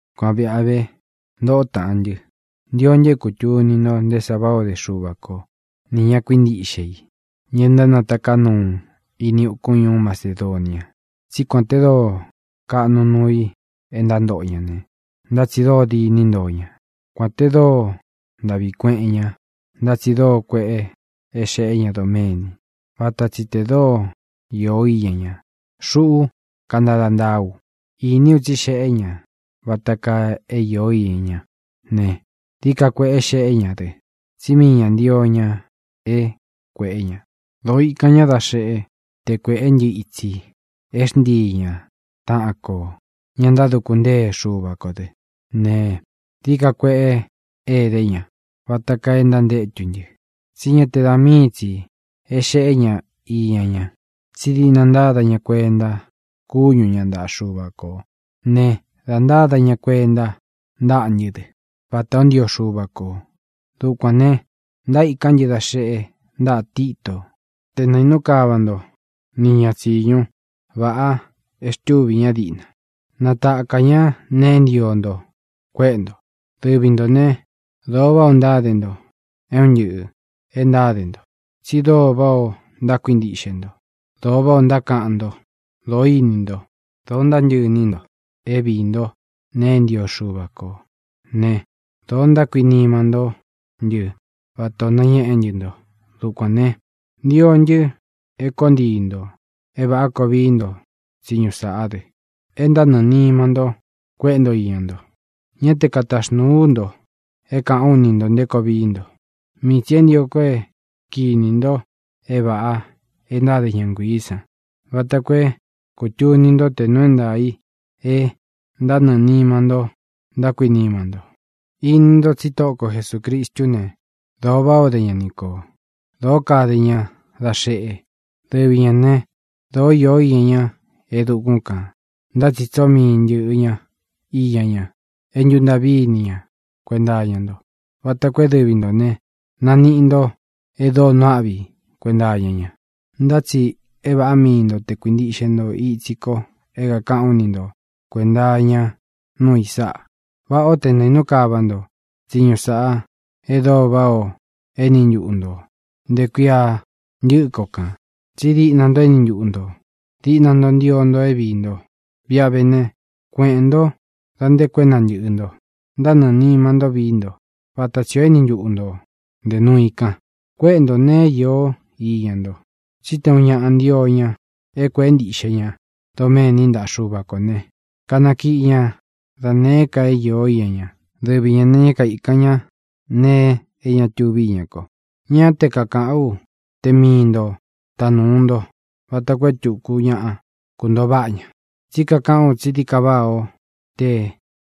Kuan vīꞌa vé, ntōꞌó taꞌan ntɨ́, ntio ntɨ é kūtuni nto nté sa váꞌā o dé Xuva ko nī ña kuíntiꞌxe i, ña ntánataká nuu ini ukún ñuú Macedonia. Tsí kuān te dóo kaꞌnu nuu i é ntántoꞌo ña ne, ntá tsi dóo diní ntoo ña; kuān te dóo ntaꞌvi kueꞌen ña, ntá tsi dóo kueꞌe é xeꞌé ña doméni, vata tsi tē dóo īó iña ña. Xuꞌú kantada ntaa u. Iní u tsí xeꞌé ña vata kaa é iō íña ñá ne, dií ka kueꞌé xeꞌé ña dɨ, tsí mii ñā ntío ña é kuēꞌé ña. Dōo ikan ñá da xeꞌe te kuéꞌe ntɨ́ itsi é xntii ña taꞌan kō ña ntáduku ntée Xuva kō dɨ. Ne, dií ka kueꞌé edé ña vata kaa e ntantétu ntɨ, tsí ña te da míi tsi é xeꞌé ña iña ña, tsí diꞌna ntáda ñā kuenta kúñu ña ntaꞌa Xuva kō ne, da ntáda ña kuenta ntáꞌa ntɨ́ dɨ, vatā ó ntio Xuva kō. Dukuān ne, ntaíkán ntɨ da xeꞌe ntáꞌa Tito te naīnú kava nto ni ña tsiñu vāꞌa e xtúvī ñá diꞌna, natakā ñá nee e ntío nto kuéꞌe nto. Dɨvi ntō né, dōo váꞌā ó ntáde nto é un ntɨꞌɨ̄ e ntáde nto; tsi dóo váꞌā ó ntákuintiꞌxe nto; dóo váꞌā ó ntákaꞌan nto; dōo íni nto; dōo ntántɨꞌɨ iní nto é viī ntó nēe e ntío Xuva ko ne, dōo ntákuinima ntó ntɨ vatā o nañéꞌe ntɨ́ nto. Dukuān ne, ntio ntɨ é koo ntii ntō é vāꞌá koo vii nto tsiñu sāꞌá dɨ, e ntánɨɨ̄ nima nto kuéꞌe nto iña nto. Ñá te kataxnūu ú ntō é kāꞌán u ni ntō nté koo vií nto; mii tsī é ntio ko é kinī nto é vāꞌa e ntáde ña nguiī san vata koo é kūtuni ntó tē nuu é ntaā i e ntánɨɨ̄ nima ntó ntákuinima nto. Ini ntó tsi Tóꞌo ko Jesūcristú ne, dōo váꞌā o dé ña ni kō; dōó kade ña da xeꞌe. Dɨvi ñā né, dōó iō iña ñá e dukún kān, ntá tsi tsóo mii ntɨ̄ꞌɨ ña iña ña, e ntúntaꞌvī ñá kuenta iña nto, vata koo é dɨvi ntō ne, naniꞌi nto e dóo nuu áꞌvi i kuenta iña ña. Ntá tsi é vāꞌá mii nto te kuīntiꞌxe nto itsi ko é kākaꞌán u ni nto kuēnta iña núu i sáꞌa: Váꞌā ó te naīnú kava nto tsiñu sāꞌá e dóo váꞌā o éni ntuꞌu ntō nte kuia ntɨ́ꞌɨ ko kān; tsí diꞌna nto éni ntuꞌu ntō; diꞌna nto ntío nto é viī nto. Viꞌa ve ne, kueꞌēn ntó dā nté koo é nantɨ̄ꞌɨ nto; ntánɨɨ̄ nima ntó vií nto vata tsī o éni ntuꞌu ntō nte nuu i kan, kuéꞌe ntō nee é iō iña nto. Tsí te ūun ñaꞌa ntio ña é kuēꞌé ntiꞌxe ña doméni ntaꞌa Xúva kō ne, kanakiꞌi ña da nēé ka é īó iña ña. Dɨvi ñā ne, ñá kaīkan ñá nēe é ña tuvi íña ko. Ñá te kakāꞌán u te mii ntō tanúu nto vata koo é tuku ñaꞌa kuntoo váꞌa ña. Tsí kakaꞌán u tsí dií ka váꞌā ó te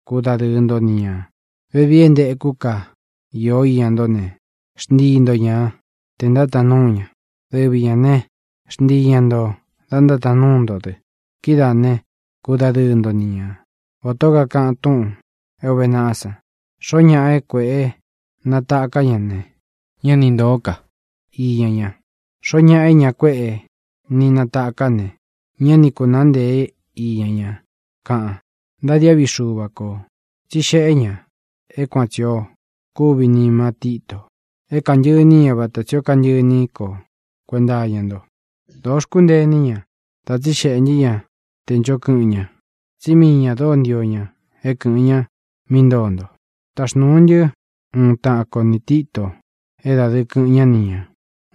kudadɨɨ nto ni ñā. Vevii é ntekú ka īo iña ntó ne, xntii nto ña tē ntátaan núu ña; dɨvi ñā né, xntii ña ntō da ntátaan núu nto dɨ. Kidáā né, kudadɨɨ nto ni ña, vatā ó kakaꞌan túꞌūn é ūve naꞌá san: “Xoó ñaꞌa é kuēꞌé natāká ña ne, ñá ni ntōó ka iña ña; xoó ñaꞌa é ña kuéꞌe ni nataká ne, ñá ni kūnáa ntēé iña ña”, kaꞌan. Ntadiáꞌvi Xuva kō, tsí xeꞌé ña é kuan tsī ó kuvi nima Títo é kantɨꞌɨ iní ña vata tsī ó kantɨꞌɨ iní ko kuenta iña nto. Dōo xkúntee iní ña dá tsixeꞌē ntɨ́ ña tē ncho kɨꞌɨn ña, tsí mii ñā dóo ntio ña é kɨ̄ꞌɨn ña mí ntoo nto. Taxnūu ntɨ́ uun taꞌan ko nī Tito é dādɨɨ kɨꞌɨn ñá ni ñā,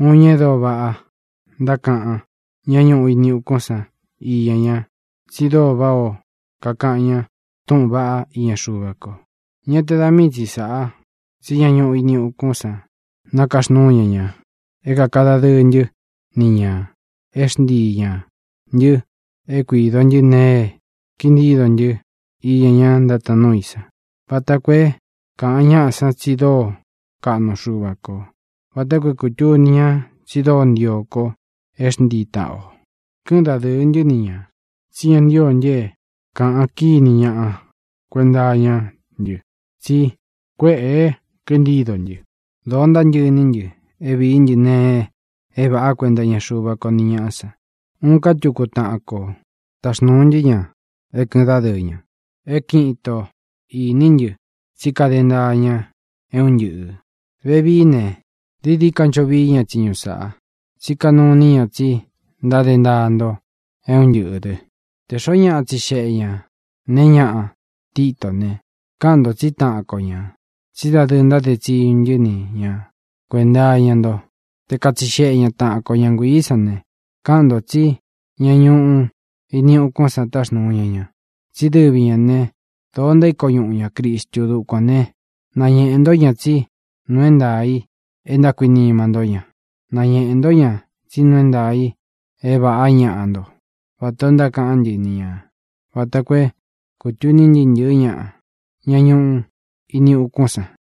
uun ñaꞌa e dóo váꞌa ntákaꞌan ñá ñuꞌu ini ukún san íña ña, tsi dóo váꞌā ó kakaꞌan ña túꞌūn vaꞌá iña Xuva ko. Ñá te da mii tsi sāꞌa, tsí ña ñuꞌu ini ukún san nakaxnúu ña ña é kāka dadɨɨ ntɨ́ ni ñā é xntii ñā ntɨ é kuīdo ntɨ́ nēe e kintído ntɨ́ iña ña ntátaan núu i san, vata koo é kāꞌan ñaꞌa san tsi dóo kaꞌnu Xuva kō, vata koo é kūtuni ña tsi dóo ntio ko é xntii taꞌan ō. Kɨ́ꞌɨn dādɨɨ ntɨ́ ni ñā, tsí ña ntío ntɨ é kāꞌan kíni ñaꞌa kuenta iñá ntɨ tsí kuēꞌe e kintído ntɨ. Dōo ntántɨꞌɨ iní ntɨ é vīí ntɨ nēe é vāꞌá kuenta iña Xuva ko ni ñaꞌá san. Uun ká tuku taꞌan kō táxnūu ntɨ́ ña é kɨ̄ꞌɨn dádɨɨ ña. É kiꞌin ito īní ntɨ tsí kade ntaa ña é un ntɨꞌɨ̄. Vevií ne, dií dií ka ncho vií ña tsiñu sāꞌa, tsí kanuu iní ña tsi ntáde ntaa nto é un ntɨꞌɨ̄ dɨ. Tē xoó ñaꞌa tsixeꞌe ña nēe ñáꞌa Titó ne, káꞌan nto tsí taꞌan ko ñā, tsí dadɨɨ ntáde tsiñu ntɨ́ ni ña kuēnta iña nto. Te katsixeꞌe ña tāꞌan ko ña nguií san ne, káꞌan ntō tsí ña ñuꞌu ini ukún san táxnūu ña ña, tsí dɨvi ñā né, dōo ntaíko ñuꞌu ñā Cristu. Dukuān né, nañeꞌē ntó ña tsí nuu é ntaā i e ntákuinima ntó ña; nañeꞌē ntó ña tsí nuu é ntaā i é vāꞌá ñaꞌa nto, vatā o ntákaꞌán ntɨ ni ñā, vata koo é kūtuni ntɨɨ́ ntɨ̄ɨ́ ñaꞌa, ña ñuꞌu ini ukún san.